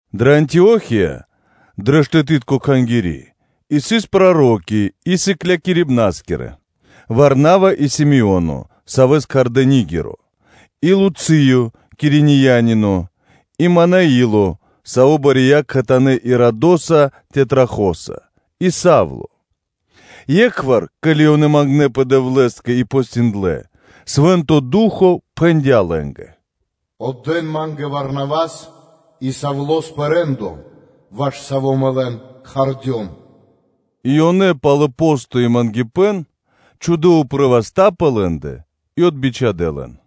Дрэ Антио́хия, дрэ штэты́тко кхангири́ сыс проро́ки и сыклякирибнаскирэ: Варнава, и Симеоно, савэ́с кхардэ́ Нигеро, и Луцыё Киринеянино, и Манаило, саво́ бария кхэтанэ́ Ирадоса тетрархоса и Савло. Екхвар, ке́ли ёнэ мангнэпэ Ра́скэ-Дэвлэ́скэ и постиндлэ, Свэ́нто Ду́хо (Фа́но) пхэндя́ лэ́нгэ: “Отдэ́н Ма́нгэ Варнавас и Савлос пэ рэ́ндо (де́ло), ваш саво́ Мэ лэн кхардём.” И ёнэ, пало́ посто и мангипэ́н, чхудэ́ упрэ́ васта́ пэ лэ́ндэ, и отбичхадэ лэн.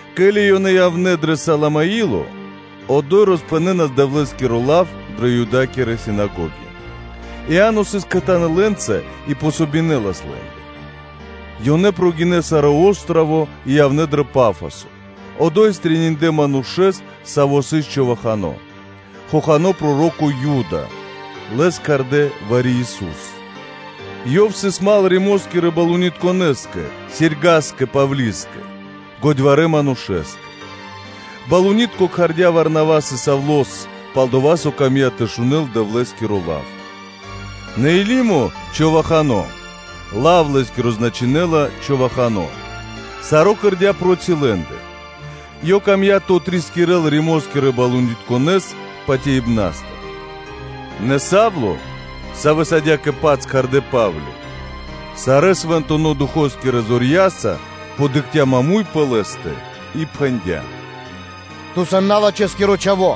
Ке́ли ёнэ явнэ́ дро Саламино, одо́й ёнэ роспхэнэнас Дэвлэ́скиро лав дрэ Юдэя́кирэ синагоги. Иа́но сыс кхэтанэ́ лэ́нца и дэ́лас васт лэ́нгэ. Ёнэ гинэ́ пир саро́ о́строво (джип) и явнэ́ дро Пафосо, одо́й стрэниндлэ манушэ́с, саво́ сыс човахано, хохано́ проро́ко Юдо, лэс кхардэ́ Вариисусо, ёв сыс мал (дру́го) Римо́скирэ балунитконэскэ Серьгаскэ Павлискэ, годьварэ́ манушэ́скэ. Балунитко кхардя́ Варнавас и Савлос, пал-дова́ со камдя́ тэ шунэ́л Дэвлэ́скиро лав. Нэ Елимо, човахано (лав лэ́скиро значынэ́ла “човахано”), саро́ кэрдя́ проти лэ́ндэ; ёв камдя́ тэ отрискирэл Римо́скирэ балунитконэс патяибнастыр. Нэ Савло, савэ́с адя́кэ-паць кхардэ́ Па́вли, сарэ́ Свэнтонэ́ Духо́скирэ зорья́са, дыкхця маму́й пэ лэ́стэ, и пхэндя́: “Ту, сан налачхэскиро чхаво́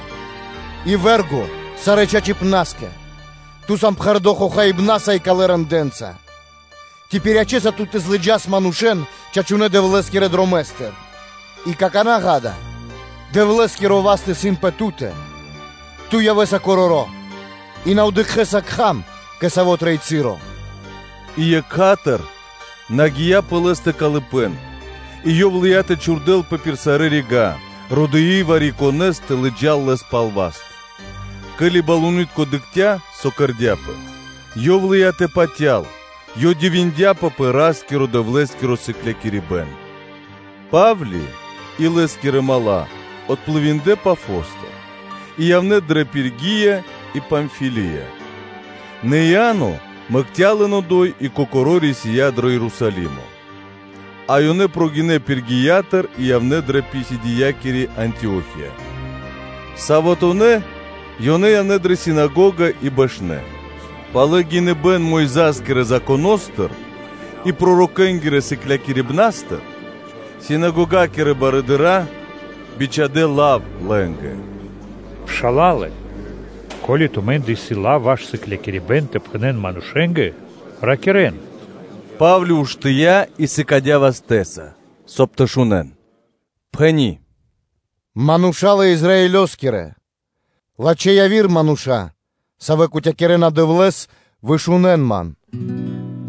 и вэ́рго сарэ́ чачипнаскэ: ту сан пхэрдо́ хохаибнаса и калэ́ рэндэ́нца; ци пириячэса ту тэ злыджас манушэ́н чачунэ́ Ра́скирэ-Дэвлэ́скирэ дромэ́стыр? И какана́, ґа́да, Дэвлэ́скиро васт исын пэ ту́тэ: Ту явэ́са короро́ и ту на явэ́са тэ дыкхэ́с кхам кэ саво́ трэй часо.” И екха́тыр згия пэ лэ́стэ калыпэ́н, и ёв лыя́ тэ чхурдэлпэ пир сарэ́ рига́, родыи вари-конэ́с тэ лыджа́л лэс пал васт. Ке́ли балуни́тко (консуло) дыкхця́, со кэрдя́пэ, ёв лыя́ тэ патял, и ёв дивиндяпэ пэ Ра́скирэ-Дэвлэ́скиро сыклякирибэ́н. Па́вли и лэ́скирэ мала́ отплывиндлэ (дынэ́ пли́ма криг) Пафостыр и явнэ́ дрэ Пергия и Памфилия; нэ Иа́но мэкця́ лэн одо́й и кокоро́ рисия́ дро Ерусалимо. А ёнэ прогинэ́ Пергиятыр и явнэ́ дрэ Писидиякири Антио́хия, саватонэ́ (суботонэ́) ёнэ явнэ́ дрэ синагога и бэшнэ́. Пало́ (после) гиныбэ́н Мойза́скирэ Законо́стыр и пророкэ́нгирэ сыклякирибнастыр, синагогакирэ барыдыра́ бичхадэ́ лав лэ́нгэ: “Мануша́лэ-Пшала́лэ! Ко́ли тумэ́ндэ исын лав ваш сыклякирибэ́н тэ пхэнэ́н манушэ́нгэ, то ракирэ́н. Па́вли уштыя́ и сыкадя́ вастэ́са, соб (кай) ёнэ тэ шунэ́н, пхэни́: “Мануша́лэ Израилёскирэ! Лачхэ́ яви́р мануша́, савэ́ кутякирэна Дэвлэ́с, вышунэн ман: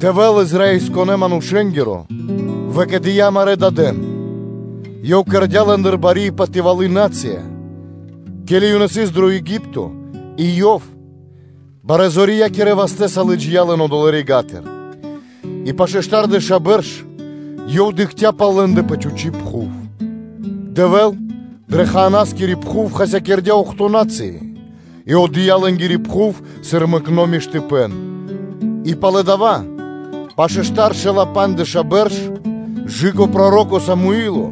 Дэвэ́л Израилёскирэ манушэ́нгиро выкэдыя́ амарэ́ дадэн, Ёв кэрдя́ лэ́ндыр бари и патывалы́ нацыя, ке́ли ёнэ сыс дро Еги́пто, и Ёв барэ́-зорьякирэ вастэ́са лыджия́ лэн одолэ́ рига́тыр, И пашэ́ штардэша́ бэрш Ёв дыкхця́ пал лэ́ндэ пэ чхучи́ пхув. Дэвэ́л пэ Ханаано́скири пхув хасякирдя́ охто́ (бидуе́нгиро дэш) на́цыи и отдыя́ лэ́нгири пхув, сыр мэкно́ миштыпэ́н. И пало́ дава́, пашэ́ штаршэла́ пандждэша́ бэрш, кэ/жы́ко проро́ко Самуи́ло,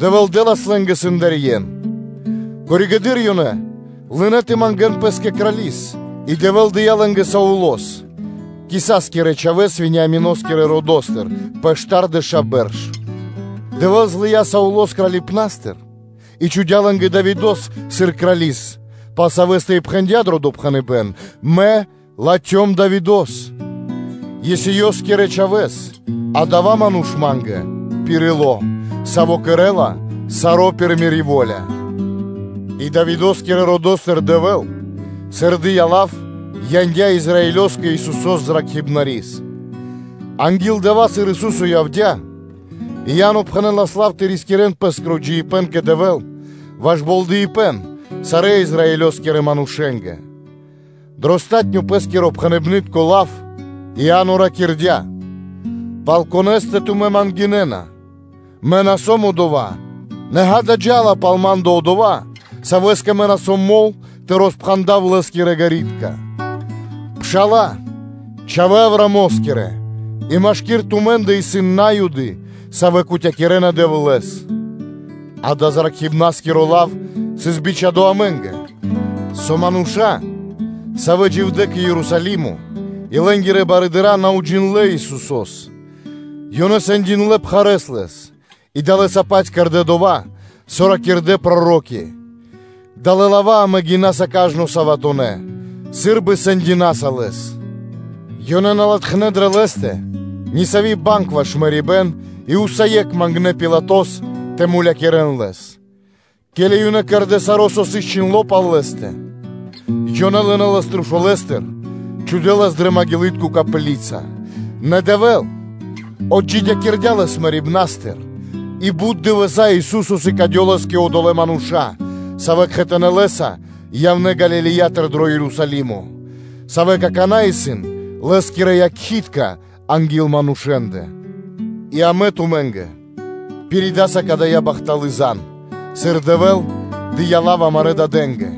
Дэвэ́л дэ́лас лэ́нгэ сэндарьен. Коригэды́р (позжэ) ёнэ лынэ́ тэ мангэ́н пэ́скэ Крали́с, и Дэвэ́л дыя́ лэ́нгэ Саулос, Кисаскирэ чхавэ́с, Вениамино́скирэ родо́стыр пэ штардэша́ бэрш. Дэвэ́л злыя́ Саулос кралипнастыр и чхудя́ лэ́нгэ Давидо́с сыр крали́с, пал савэ́стэ и пхэндя́ дро допхэныбэ́н: “Мэ латхём Давидо́с, Есеёскирэ чхавэ́с, адава́ ману́ш Ма́нгэ исын пир ило́, саво́ кэрэ́ла саро́ пир Мири́ во́ля. И Давидо́скирэ родо́стыр Дэвэ́л, сыр Ёв дыя́ лав, яндя́ Израилёскэ Исусо́с Зракхибнаскирэс; анги́л дава́, сыр Ису́со явдя́, Иа́но пхэнэлас лав тэ рискирэ́н пэ́скиро джиибэ́н кэ Дэвэ́л ваш болдыипэн сарэ́ Израилёскирэ манушэ́нгэ.” Дро палатуно́ (последнё) пэ́скиро пхэныбнытко лав, Иа́но ракирдя́: “Пал конэ́стэ тумэ́ ман гинэ́на? Мэ на сом одова́; нэ ґа́да, джа́ла пал ма́ндэ Одова́, Савэ́скэ мэ на сом мол тэ роспхандав Лэ́скирэ ґэритка.” Мануша́лэ-Пшала́лэ, Чхавэ́ Авраамо́скирэ, и машки́р тумэ́ндэ исын На́юды, савэ́ кутякирэна Дэвлэ́с! Дава́ зракхибнаскиро лав сыс бичхадо́ амэ́нгэ: со мануша́, савэ́ дживдэ́ кэ Ерусалимо и лэ́нгирэ барыдыра́, на уджиндлэ́ Исусо́с, ёнэ сэндиндлэ пхарэ́с Лэс и далэ́са-паць кэрдэ́ дова́, со ракирдэ́ проро́ки, далэ́ лава́ амэ гинаса кажно саватонэ́ (суботонэ́), сы́рбы сэндинаса Лэс. Ёнэ на латхнэ́ дрэ Лэ́стэ нисави́ банг ваш мэрибэ́н, и усае́кх мангнэ́ Пилатос тэ мулякирэ́н Лэс. Ке́ли ёнэ кэрдэ́ саро́, со сыс чхиндло́ пал Лэ́стэ, ёнэ лынэ́ Лэс трушулэстыр, чхудэ́ Лэс дрэ маґилытко копли́ца. Нэ Дэвэ́л отджидякирдя́ Лэс мэрибна́стыр; И бут дывэса́ Ису́со сыкадёлас кэ одолэ́ мануша́, савэ́ кхэтанэ́ Лэ́са явнэ́ Галилеятыр дро Ерусалимо, савэ́ какана́ исын Лэ́скирэ якхи́тка анги́л манушэ́ндэ. И амэ пиридаса кадая́ бахталы́ зан (звесь) тумэ́нгэ, сыр Дэвэ́л дыя́ лав амарэ́ дадэ́нгэ,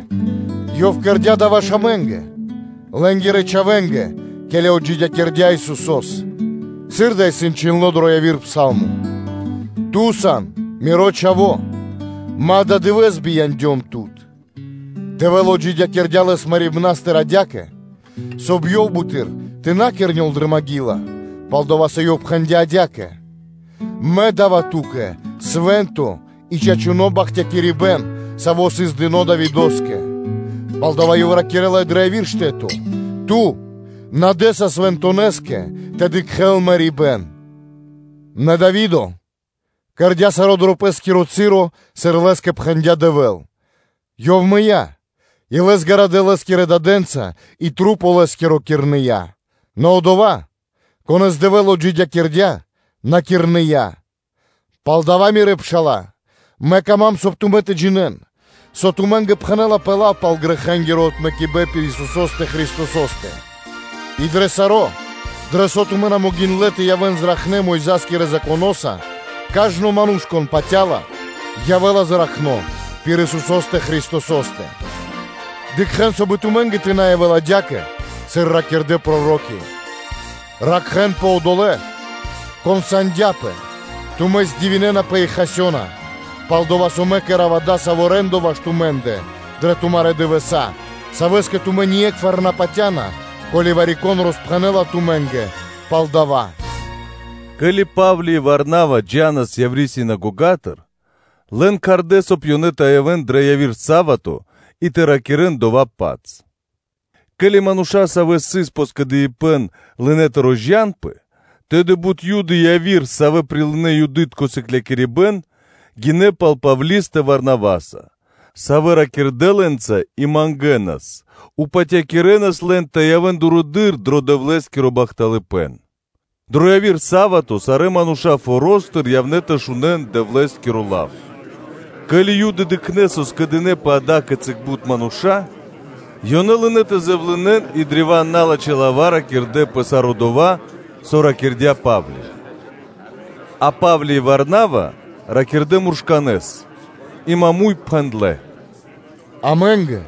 Ёв кэрдя́ дава́ ваш амэ́нгэ, лэ́нгирэ чхавэ́нгэ, ке́ли отджидякирдя́ Исусо́с, сыр дава́ исын чхиндло́ дро яви́р пса́лмо: “Ту сан Миро Чхаво́: Мэ ададывэ́с бияндём Тут.” Дэвэ́л отджидякирдя́ Лэс мэрибна́стыр адя́кэ, соб (кай) Ёв буты́р тэ на кирнёл дрэ маґила, пал дава́ Ёв пхэндя́ адя́кэ: “Мэ да́ва Ту́кэ свэ́нто и чачуно́ бахтякирибэ́н, саво́ сыс дыно́ Давидо́скэ.” Палдава́ Ёв ракирэ́ла и яви́р штэ́то: “Ту на дэ́са Свэнтонэскэ тэ дыкхэ́л мэрибэ́н.” Нэ Дави́до кэрдя́ саро́ дро пэ́скиро часо, сыр лэ́скэ пхэндя́ Дэвэ́л, ёв мыя́, и лэс гарадэ́ лэ́скирэ дадэ́нца и тру́по лэ́скиро кирныя. Нэ Одова́, Конэ́с Дэвэ́л отджидякирдя́, на кирныя. Палдава́, Мануша́лэ-Пшала́лэ, мэ кама́м, соб (кай) тумэ́ тэ джинэ́н, со тумэ́нгэ пхэнэ́лапэ лав пал грэхэнгиро отмэкибэн пир Исусо́стэ Христосо́стэ, и дрэ саро́, дрэ со тумэ́ на могиндлэ́ тэ явэ́н зракхнэ́ Мойза́скирэ Законоса, кажно ману́ш, кон патя́ла, ячэ́ла чачипна́скиро пир Исусо́стэ Христосо́стэ. Дыкхэ́н, соб (кай) и тумэ́нгэ тэ на явэ́л адя́кэ, сыр ракирдэ́ проро́ки: “Ракхэ́нпэ тумэ́, кон дыкхэ́ла бипатывакирэс пэ яви́р манушэ́ндэ, тумэ́ здивинэнапэ и хасёна; пал-дова́ со Мэ кэра́ва дасаво рэ́ндо ваш тумэ́ндэ дрэ тумарэ́ дывэса́, савэ́скэ тумэ́ ние́кхвар на патя́на, ко́ли вари-кон роспхэнэ́ла тумэ́нгэ пал дава́.” Ке́ли Па́вли и Варнава джа́нас явирэ синагогатыр, лэн кхардэ́, соб (кай) ёнэ тэ явэ́н дро яви́р са́вато и тэ ракирэ́н дова́-паць. Ке́ли мануша́, савэ́ сыс пэ скэдыибэ́н, лынэ́ тэ розджанпэ, тэды бут Юды и яви́р, савэ́ прилынэ́ Юды́тко сыклякирибэ́н, гинэ́ пал Павлистэ Варнаваса, савэ́ ракирдэ́ лэ́нца и мангэнас, упатякирэнас лэн тэ явэ́н дурэды́р дро Дэвлэ́скиро бахталыпэ́н. Дро яви́р са́вато сарэ́ мануша́ форо́стыр явнэ́ тэ шунэ́н Дэвлэ́скиро лав. Ке́ли Юды дыкхнэ́, со скэдынэ́пэ ада́кицы бут мануша́, ёнэ лынэ́ тэ зэвлынэн и ракирдэ́ древа́н налачхэ́ лава́ пэ саро́ дова́, со ракирдя́ Па́вли. А Па́вли и Варнава ракирдэ́ муршканэ́с и бидаракирэс пхэндлэ́: “Амэ́нгэ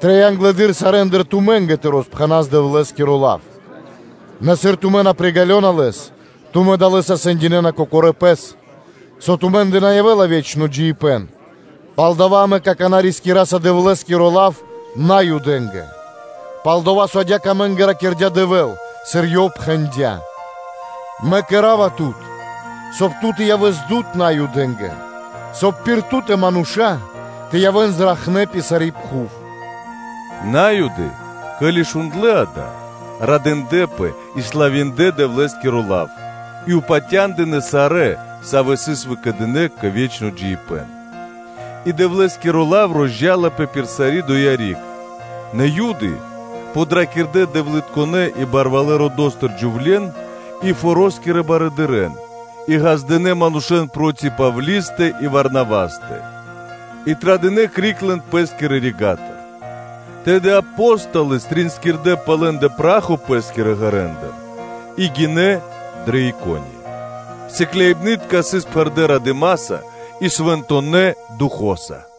трэй англэды́р сарэ́ндыр тумэ́нгэ тэ роспхэнас Дэвлэ́скиро лав: нэ сыр тумэ́ на приґалёна лэс, тумэ́ далэ́са сэндинэна кокорэ́ пэс, со тумэ́ндэ на явэ́ла ве́чно джиибэ́н, палдава́ амэ какана́ рискираса Дэвлэ́скиро лав Наюдэ́нгэ; палдава́, со адя́кэ амэ́нгэ ракирдя́ Рай Дэвэ́л, сыр Ёв пхэндя́: “Мэ кэра́ва Тут, соб (кай) ту тэ явэс дуд Наюдэ́нгэ, соб (кай) пир Ту́тэ мануша́ тэ явэ́н зракхнэ́ пир сари́ пхув.” На́юды, ке́ли шундлэ́ дава́, радындлэпэ и славиндлэ Дэвлэ́скиро лав, и упатя́ндынэ сарэ́, савэ́ сыс выкэдынэ́ кэ ве́чно джиибэ́н; И Дэвлэ́скиро лав розджаласпэ пир сари́ доя́ риг. Нэ Юды, подракирдэ дэвлытконэ́ и барвалэ́ родо́стыр джувле́н и форо́скирэ барыдырэ́н, и ґаздынэ́ манушэ́н проти Павлистэ и Варнавастэ, и традынэ криг лэн пэ́скирэ рига́тыр. Тэды Апо́столы тринскирдэ пэ лэ́ндэ пра́хо пэ́скирэ ґэрэндыр и гинэ́ дрэ Икония. Сыкляибны́тка сыс пхэрдэ́ радыма́са и Свэнтонэ́ Духо́са.